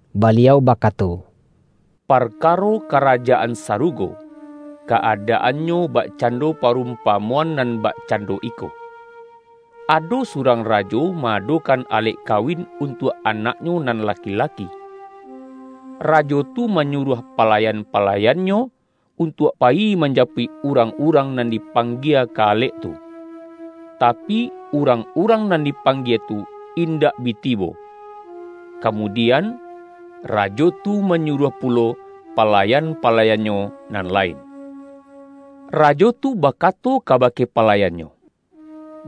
Baliau bakato,”Parkaro Ka-rajaan Sarugo, ka-adaannyo bakcan-do parumpamoan nan bakcando iko: Ado surang rajo ma-adokan alek kawin untuak anaknyo nan laki-laki. Rajo tu manyuruah palayan-palayannyo, untuak payi manjapuik urang-urang nan dipanggie ka alek tu. Tapi, urang-urang nan dipanggie tu indak bi tibo. Kamudian, rajo tu manyuruah pulo palayan-palayannyo nan lain. Rajo tu bakato kabake palayannyo: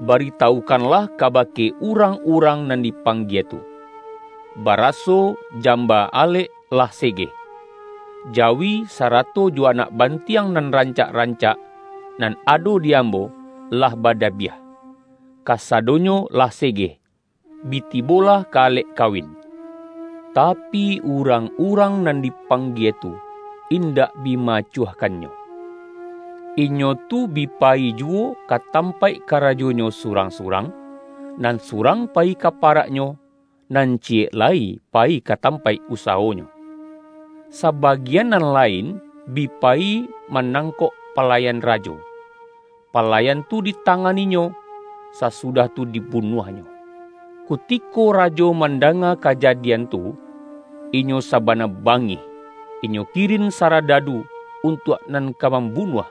’Bari-tawukanlah kabake urang-urang nan dipanggie tu: Baraso jamba alek lah segeh. Jawi, sarato jo anak bantiang nan rancak-rancak, nan ado di am-bo, lah badabiah. Kasadonyo lah se-geh. Bi tibolah ka alek kawin!’ Tapi, urang-urang nan dipanggie tu indak bi ma-acuahkannyo. Inyo tu bi payi juwo ka tampaik karajonyo surang-surang nan surang payi ka parak-nyo, nan ciyek lai payi ka tampaik usawonyo; sabagian nan lain bi payi manangkok palayan rajo, palayan tu ditanganinyo, sasudah tu dibunuah-nyo. Kutiko rajo mandanga kajadian tu, inyo sabana bangih. Inyo kirin sa-radadu untuak nan ka mambunuah,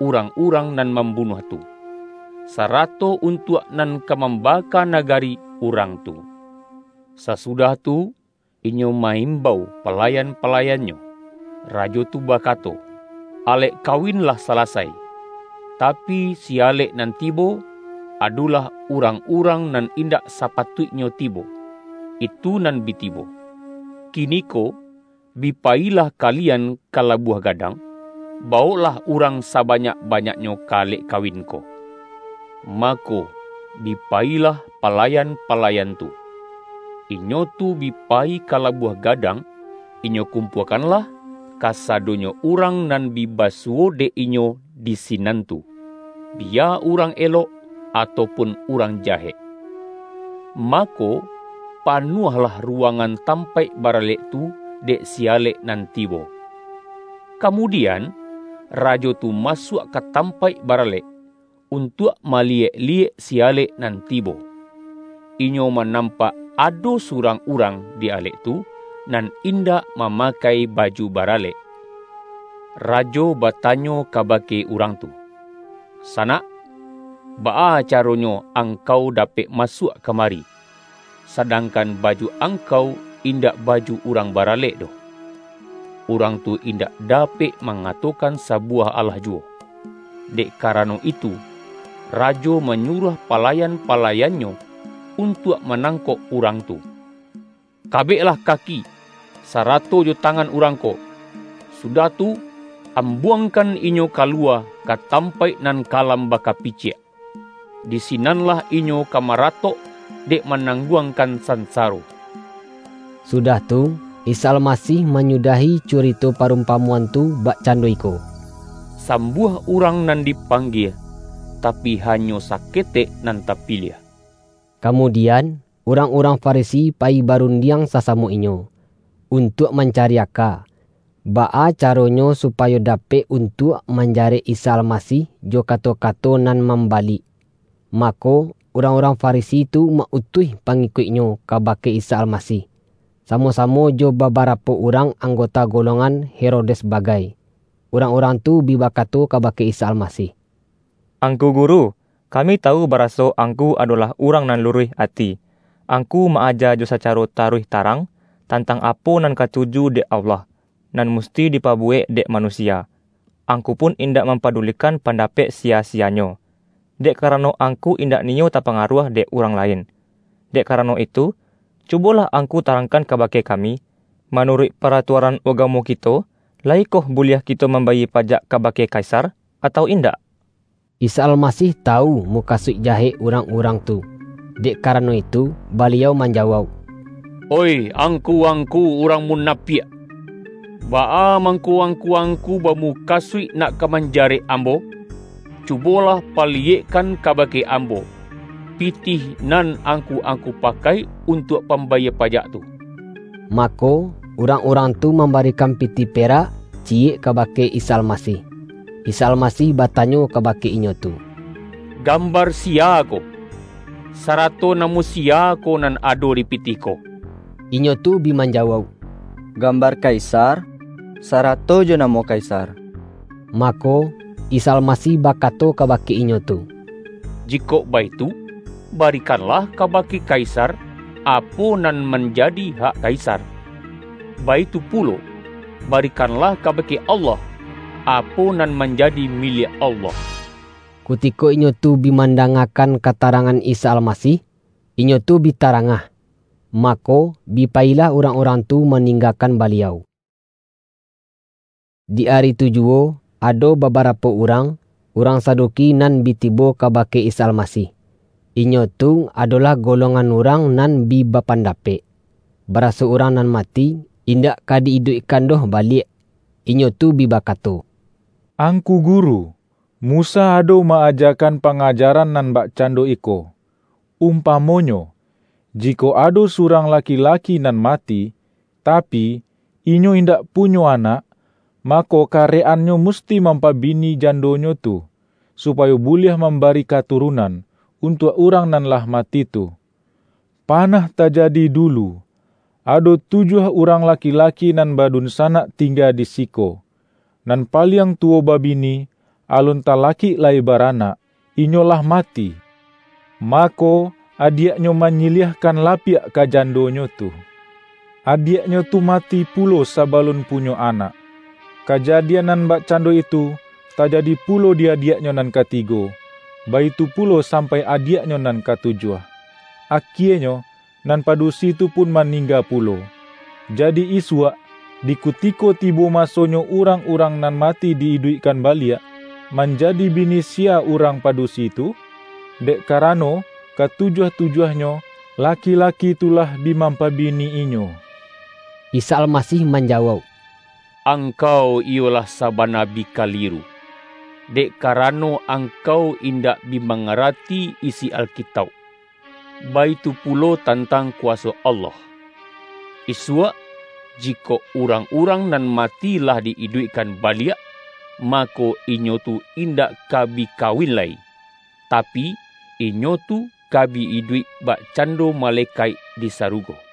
urang-urang nan mambunuah tu, sa-rato untuak nan ka mambaka nagari urang tu. Sasudah tu, inyo ma-imbau palayan-palayannyo. Rajo tu bakato, ’Alek kawin lah salasai, tapi, si-alek nan tibo, adolah urang-urang nan in-dak sapatuiknyo tibo, itu nan bi tibo. Kiniko bi payilah kalian ka labuah gadang, bawoklah urang sabanyak-ba-nyaknyo ka alek kawin ko.’ Mako, bi payilah palayan-palayan tu. Inyo tu bi payi ka labuah gadang, inyo kumpua-kanlah, kasadonyo urang nan bi ba-suwo dek inyo di sinan tu, biya urang elok atau pun urang jahek. Mako, pa-nuahlah ruwangan tampaik baralek tu dek si-alek nan tibo. Kamudian, rajo tu masuak ka tam-paik baralek, untuak maliyek-liyek si-alek nan tibo. Inyo manampak ado surang urang di alek tu, nan indak ma-makai baju baralek. Rajo batanyo kabake urang tu, ’Sanak, baa caronyo angkau dapek masuak kamari, sadang-kan, baju angkau indak baju urang ba-ralek doh?'Urang tu indak dapek ma-ngatokan sabuwah alah juwo. Dek karano itu, rajo manyuruah palayan-palayannyo untuak manangkok urang tu, ’Kabeklah kaki, sarato jo tangan urang ko, sudah tu, ambuangkan inyo kaluwa ka tampaik nan kalam baka-piciak. Di sinanlah inyo ka maratok, dek manangguangkan sansaro.’” Sudah tu, Isa Almasih manyudahi curito parumpamoan tu bakcando iko,”Sambuah urang nan dipanggie, tapi, hanyo saketek nan tapiliah.” Kamudian, urang-urang Farisi payi barundiang sasamo inyo, untuak man-cari aka, baa caronyo supayo dapek untuak manjarek Isa Almasih jo kato-kato nan mambalik. Mako, urang-urang Farisi tu ma-utuih pangikuik-nyo kabake Isa Almasih, samo-samo jo babarapo urang anggota golongan Herodes bagai. Urang-urang tu bi ba-kato kabake Isa Almasih,”Angku Guru, kami tawu baraso Angku adolah urang nan luruih ati. Angku ma-aja jo sacaro taruih tarang, tantang apo nan katuju dek Allah, nan musti dipabuwek dek manusia, Angku pun indak mam-padulikan pandapek siya-siyanyo. Dek karano Angku indak niyo tapangaruah dek urang lain. Dek karano itu, cu-bolah Angku tarangkan kabake kami: Manuruik paratuaran ugamo kito, la-yikoh buliah kito mambayie pajak ka-bake Kaisar, atau indak?” Isa Almasih tawu mukasuik jahek urang-urang tu, dek karano itu, Baliau manjawauk,”Oih, angku-angku urang munapiak! Baa mangko angku-angku bamukasuik nak ka manjarek Ambo? Cubolah paliyekkan kabake Ambo, pitih nan angku-angku pakai untuak pambayie pajak tu!” Mako, urang-urang tu mambarikan pitih perak ciyek kabake Isa Almasih. Isa Almasih batanyo kabake inyo tu,”Gambar siya ko, sarato namo si-ya ko nan ado di pitih ko?” Inyo tu bi manjawauk”Gambar kaisar, sarato jo namo kaisar.” Mako, Isa Almasih bakato kabake inyo tu,”Jikok baitu, barikanlah kaba-ke kaisar, apo nan manjadi hak kaisar, baitu pulo, barikanlah kabake Allah, apo nan manjadi miliak Allah.” Kutiko inyo tu bi mandangakan katarangan Isa Almasih, inyo tu bi ta-rangah. Mako, bi payilah urang-urang tu maninggakan Baliau. Di ari tu juwo, ado babarapo urang, urang Saduki nan bi tibo kaba-ke Isa Almasih. Inyo tu adolah golong-an urang nan bi bapandapek, baraso urang nan mati, indak ka di-iduikkan doh baliak. Inyo tu bi bakato,”Ang-ku Guru, Musa ado ma-ajakan panga-jaran nan bakcando iko: Umpamonyo, jikok ado surang laki-laki nan mati, ta-pi, inyo indak punyo anak, mako, ka-rek-annyo musti mampabini jandonyo tu, supayo buliah mambari katurunan, untuak urang nan lah mati tu. Pa-nah tajadi dulu, ado tujuah urang la-ki-laki nan badunsanak tingga di siko. Nan paliang tuwo babini, alun tala-kik lai baranak, inyolah mati. Mako, adiaknyo manyiliahkan lapiak ka jan-donyo tu. Adiaknyo tu mati pulo sa-balun punyo anak. Kajadian nan bak-cando itu, tajadi pulo di adiaknyo nan katigo, baitu pulo sampai ka adiaknyo nan katujuah. Akienyo, nan padusi tu pun maningga pulo. Jadi isuak, di kutiko tibo masonyo urang-urang nan mati di-iduikkan baliak, manja-di bini siya urang padusi tu? Dek ka-rano, katujuah-tujuahnyo, laki-laki tu lah bi mampabini inyo.” Isa Almasih manjawauk,”Ang-kau iyo lah sabana bi kaliru, dek ka-rano angkau indak bi mangarati isi Alkitauk, baitu pulo tantang kuwaso Allah. Isuak, jikok urang-urang nan mati lah di-iduikkan baliak, mako, inyo tu indak ka bi kawin lai, tapi, inyo tu ka bi iduik bakcando malekaik di sarugo.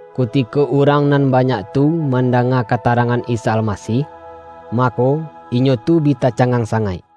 Kutiko urang nan banyak tu man-danga katarangan Isa Almasih, mako, inyo tu bi tacangang sangaik.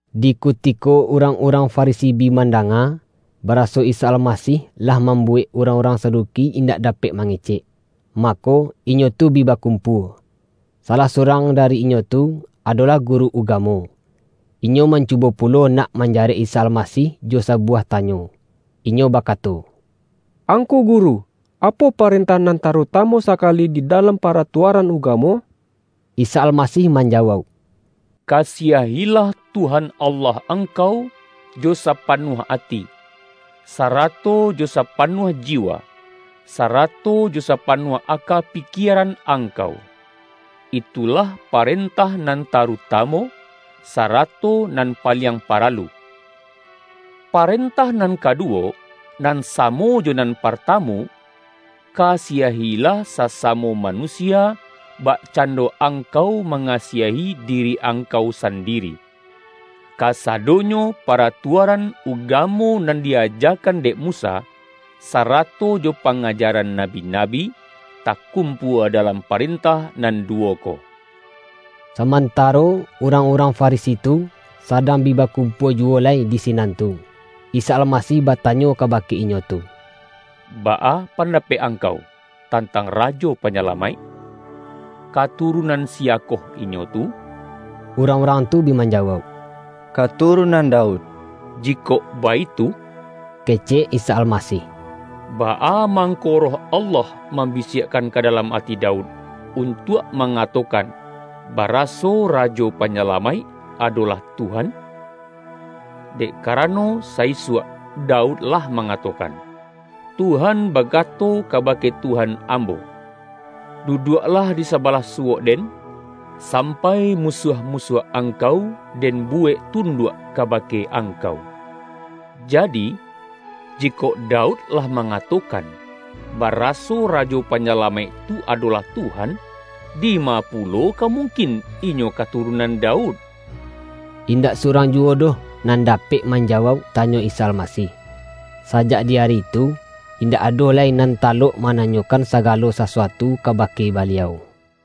Di kutiko urang-urang Farisi bi mandanga, baraso Isa Almasih lah mambuwek urang-urang Saduki indak dapek mangecek, mako, inyo tu bi ba-kumpua. Salah surang dari inyo tu, adolah guru ugamo, inyo mancubo pu-lo nak manjarek Isa Almasih jo sabu-wah tanyo. Inyo bakato,”Angku Gu-ru. Apo parentah nan tarutamu sakali di dalam paratuaran ugamo?” Isa Almasih manjawauk,”Kasiah-ilah Tuhan Allah angkau, jo sapanuah ati, sarato jo sapanuah jiwa, sarato jo sapanuah aka pikieran angkau. Itu-lah parentah nan tarutamu, sarato nan paliang paralu! Parentah nan kadu-wo, nan samo jo nan partamu: Kasiah-ilah sasamo manusia, bakcando ang-kau mangasiahi diri angkau sandiri. Kasadonyo paratuaran ugamo nan di-ajakan dek Musa, sarato jo panga-jaran nabi-nabi, takumpua dalam pa-rentah nan duwo ko.” Samantaro urang-urang Farisi tu, sadang bi bakumpua juwo lai di sinan tu, Isa Almasih batanyo kabake inyo tu, ”Baa pandapek angkau tantang Rajo Panyalamaik? Katurunan siya-koh Inyo tu?” Urang-urang tu bi manjawauk,”Ka-turunan Daud.” ”Jikok baitu,” kecek Isa Almasih,”baa mangko Roh Allah mambisiak-kan ka dalam ati Daud untuak ma-ngatokan, baraso Rajo Panyalamaik adolah ’Tuhan'? Dek karano, sa-isuak Daud lah mangatokan, ’Tuhan bakato kabake Tuhan ambo: duduaklah di sabalah suwok-Den, sampai musuah-musuah Angkau Den buwek tunduak kabake Angkau.’ Jadi, jikok Daud lah mangatokan, baraso Rajo Panyalamaik tu adolah ’Tuhan’, dima pulo ka mungkin Inyo katurunan Daud?” Indak surang juwo doh nan da-pek manjawauk tanyo Isa Almasih. Sajak di ari tu, indak ado lai nan ta-lok mananyokan sagalo sasuatu ka-bake Baliau.